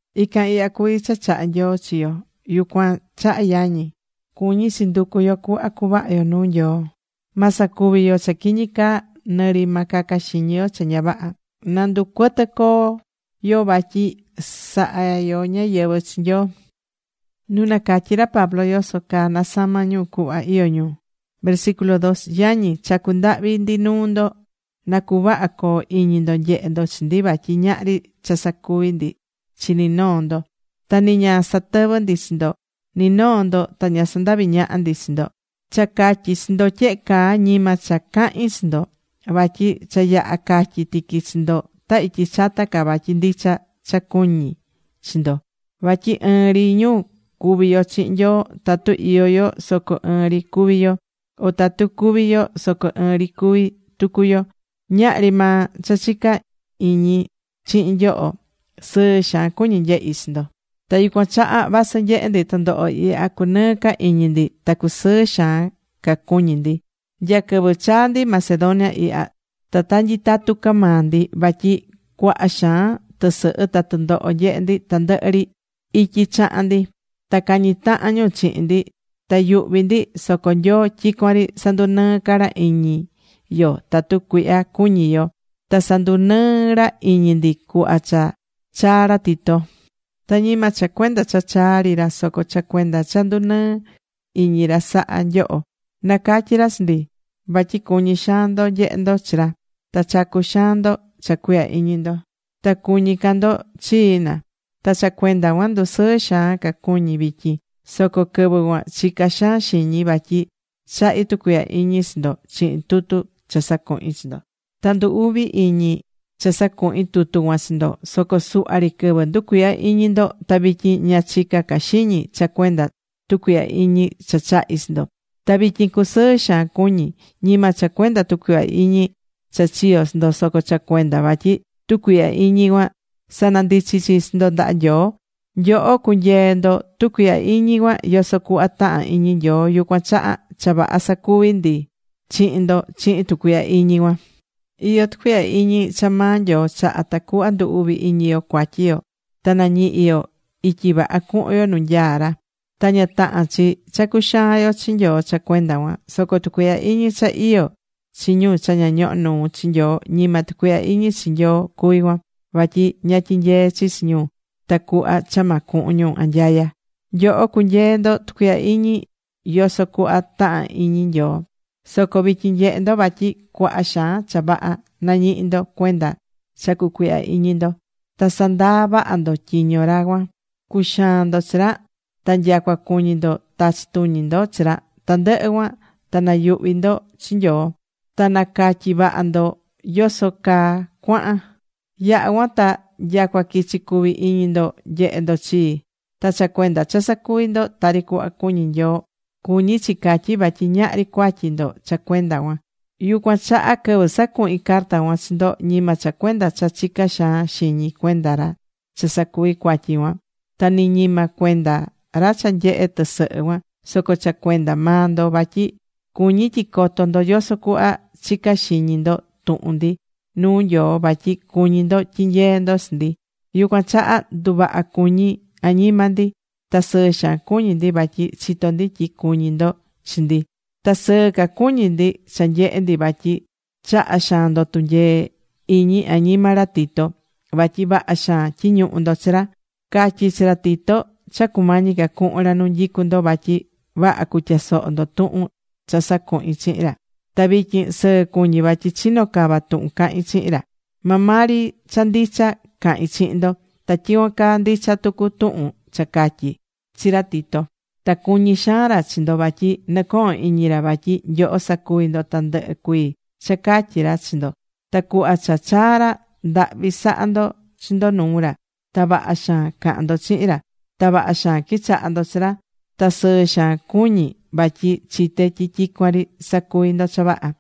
Ican ihya cuví cha chahá Nyoo chi yo. Yucuan chaha yañi, cuñí chi nducu yo cuhva cuvaha yo nuu Nyoo. Ma sacuvi yo cha quiñi caa nɨ ri ma caca xiñi yo cha ña vaha. Na ndu cuɨtɨ coo yo vatyi sahá yo ñáyɨvɨ chi Nyoo.Nu nacatyí ra Pablo yoso caa nasama̱ ñu cuhva iyó ñu Yañi, chacú ndahvi ndi nuu ndo, na cuvaha coo iñi ndo nyehé ndo chi ndi vatyi ñahri cha sacuvi̱ ndi chi ni noo ndo. Ta ni ña satɨvɨ̱ ndi chi ndo. Ni noo ndo ta ña sandavi̱ ñaha ndi chi ndo. Cha catyí chi ndo tyehe caa ñima cha cahín chi ndo. Vatyi cha yaha catyi̱ tiqui chi ndo ta ityi chata ca, vatyi ndicha cha cuñí chi ndo. Vatyi ɨɨn ri ñu cuví yo chihin Nyoo. Tatu iyó yo soco ɨɨn ri cuví yo. O tatu cúvi yo soco ɨɨn ri cuví tucu yo. Ñahri maa cha chica iñi chihin nyoho. Sɨɨ xaan cuñí nyehi chi ndo. Ta yucuan chaha vasɨ nyehé ndi tɨndoho ihya, cunɨɨ́ ca iñi ndi. Ta cusɨɨ xaan ca cuñi ndi. Nya quɨvɨ chaa̱ ndi Macedonia ihya, ta ta nyitatu ca maa ndi. Vatyi cuaha xaan tɨsɨhɨ ta tɨndoho nyehe ndi tandɨhɨ ri ityi chaha̱n ndi. Ta cañí tahan ñu chihin ndi. Ta yuhví ndi. Soco Nyoo, tyicuan ri sandunɨɨ ca ra iñi yo tatu cuihyá cuñi yo. Ta sandunɨɨ̱ ra iñi ndi cuhva cha chaa̱ ra Tito. Ta ñima cha cuenda cha chaa̱ ri ra. Soco cha cuenda cha ndunɨɨ̱ iñi ra saha̱ nyoho. Nacatyi̱ ra chi ndi vatyi cuñí xaan ndo nyehe ndo chi ndi. Ta chacu̱ xaan ndo cha cuihya iñi ndo. Ta cuñí ca ndo chii, na. Ta cha cuenda cuan ndusɨɨ xaan ca cuñí vityin. Soco quɨvɨ cuan chica̱ xaan xiñi vatyi chahi̱ tucuihya iñi chi ndo chihin tutu cha sacuhi̱n chi ndo. Ta ndu uvi̱ iñi cha sacuhi̱n tutu cuan chi ndo. Soco suhva ri quɨvɨ, nducuihya̱ iñi ndo. Ta vityin ña chicá ca xiñi cha cuenda tucuihya iñi cha chahi̱ chi ndo. Ta vityin cusɨɨ xaan cuñí, ñima cha cuenda tucuihya iñi cha chiyo̱ ndo, soco cha cuenda vatyi tucuihya iñi cuan sanandichi̱ chi ndo ndaha Nyoo. Nyoho cunyee̱ ndo tucuihya iñi cuan yoso cuhva tahán iñi Nyoo, yucuan chaha cha vaha sacuvi̱ ndi chihin ndo chihin tucuihya iñi cuan. Iyó tucuihya iñi cha maa Nyoo chahá, tacuhva ndu uvi iñi yo cuatyi yo ta nañihi yo ityi vaha cuhun yo nu nyaa ra. Ta ña tahán chi cha cuxaán yo chi Nyoo cha cuenda cuan. Soco tucuihya iñi cha iyó chi ñu cha ña ñohó nuu chi Nyoo, ñima tucuihya iñi chi Nyoo cuví cuan. Vatyi ña tyinyeé chi chi ñu tacuhva cha ma cuhun ñu anyaya. Nyoho cunyee̱ ndo tucuihya iñi yoso cuhva tahán iñi Nyoo. Soco vityin nyehé ndo vatyi cuaha xaan cha vaha nañihí ndo cuenda cha cucuihya iñi ndo. Ta sandaa̱ vaha ndo tyiño ra cuan. Cuxaa̱n ndo chi ra. Ta nyacua cuñi̱ ndo tachi̱ tuñi ndo chi ra. Tandɨhɨ cuan, ta nayuhvi̱ ndo chi Nyoo. Ta nacatyi̱ vaha ndo yoso caa cuahan. Yaha cuan ta nyacua quichi̱ cuvi iñi ndo nyehe ndo chii. Ta cha cuenda cha sacuvi̱ ndo tari cuhva cuñí Nyoo, cuñí chi catyí vatyi ñahri cuatyi ndo cha cuenda cuan. Yucuan chaha quɨvɨ sacuhi̱n carta cuan chi ndo ñima cha cuenda cha chicá xaan xiñi cuenda ra cha sacuvi̱ cuatyi cuan. Ta nɨ ñima cuenda ra cha nyehe tɨsɨhɨ cuan. Soco cha cuenda maa ndo, vatyi cuñí tyi coto ndo yoso cuhva chicá xiñi ndo tuhun ndi nuu Nyoo vatyi cuñí ndo tyinyeé ndo chi ndi. Yucuan chaha nduvaha cuñí añima ndi. Ta sɨɨ xaan cuñí ndi vatyi chitó ndi tyi cuñí ndo chi ndi. Ta sɨɨ ca cuñí ndi cha nyehé ndi vatyi chaha̱ xaan ndo tunyee iñi añima ra Tito. Vatyi vaha xaan tyiñuhu̱ ndo chi ra. Catyi̱ chi ra Tito cha cumañi ca cuhun ra nu nyicú ndo vatyi vaha cutyasoho ndo tuhun cha sacuhi̱n chihin ra. Ta vityin sɨɨ cuñí vatyi chinó cava tuhun cahín chihin ra. Maa maa ri cha ndicha cahín chihin ndo. Ta tyicuan caa ndicha tucu tuhun cha catyí chi ra Tito. Ta cuñí xaan ra chi ndo vatyi nɨcohón iñi ra vatyi nyoho sacuví ndo tandɨhɨ cuii cha catyí ra chi ndo. Ta cuhva cha chaa̱ ra, ndahvi saha̱ ndo chi ndo nuu ra. Ta vaha xaan caha̱n ndo chihin ra. Ta vaha xaan quichaha̱ ndo chi ra. Ta sɨɨ xaan cuñí vatyi chité tyi tyicuan ri sacuví ndo cha vaha.